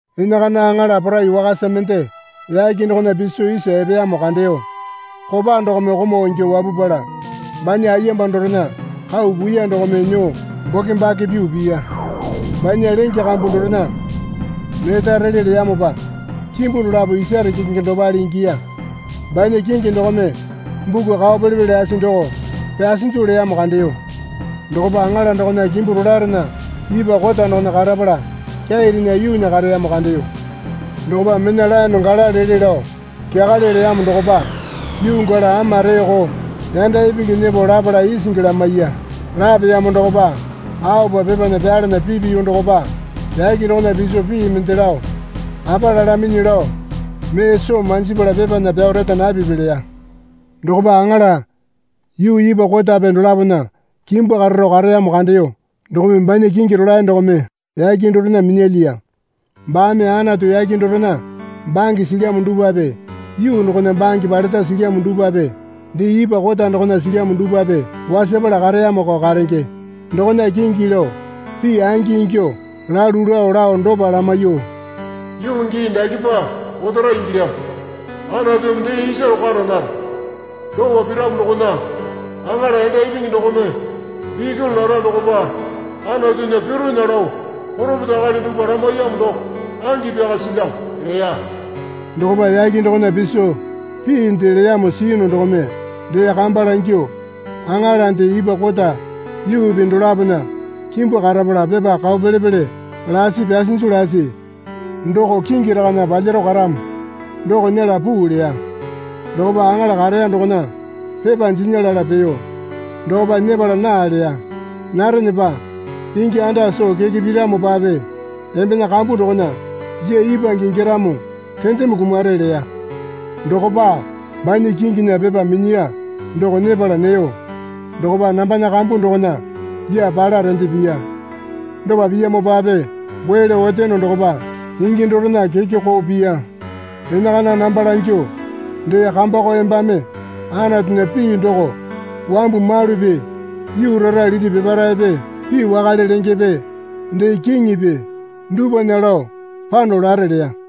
Enakana aŋala porai wakasa mende yake dokona piso isa epeyamo kandeyo. Kopa dokome komau ingyuo wapupala banya ayemba dorena kau puiya dokome nyuo bokembake pyuo piya. Banya lenge kambu dorena neta rele leyamopa kimbu dolapo isare kekenge dopale ingiya. Banya kingi dokome buku kao pele pele lasi doko pyasinju leyamo kandeyo dokopa aŋala dokona kimbu rolaerena ipwa kota dokona karapala kyairena yuunya kareyamo kandeyo. Dokopa mena laene gala lele lao kyakale leyamo dokopa yuu gala ama reeko yanda ipingi nyepo lapala isingi lamaiya. Lapeyamo dokopa aopa pepana pyalana pipiyu dokopa, yake dokona piso pii mende lao, Apa lalaminyi lao mee soo manjipala pepana pyao reta napipi leya. Dokopa aŋala yuu ipwa kotape dolapona kimbu kararo kareyamo kandeyo dokome banya kingi rolae dokome yake dorena minyalyiya. Baame Anatu yake dorena bange silyamo dupwape yuu dokona bange paleta silyamo dupwape dee ipwa kota dokona silyamo dupwape wasapala kareyamoko karenge dokona kingi lao pii angi ingyuo lalu lao lao dopa lamaiyuo, Yuu gii dakepa otara ingilyamo, Anatumi dee isaro kara nara. Dopa piramo dokona aŋala yanda ipingi dokome bikuli lara dokopa Anatunya pironya lao poropeta akali dupwa lamaiyamo doko angi pyaka silyamo leya. Dokopa yake dokona piso piinde leyamo siyunu dokome dee kamba langyuo, Aŋalande ipwa kota yuupi dolapona kimbu karapala pepa kao pele pele lasi pyasinju lasi doko kingi rakana palyaro karamo doko nyela puu leya. Dokopa aŋala kareya dokona pepa jinya lala peyo. Dokopa nyepala naa leya. Narenepa ingi anda soo keke piramopape embena kambu dokona lyaa ipwange ingyaramo rendeme kumare leya. Dokopa banya kinginya pepa minyiya doko nyepala neyo dokopa nambana kambu dokona lyaa pala rende piya. Dopa piyamopape goe lao oteyono dokopa ingi dorena keke koo piya. Enakana namba langyuo, Dee kambako embame Anatunya pii doko wambu malupi yuu rara liti peparaepe pii wakale lengepe dee kiŋipi dupwana lao pano lare leya.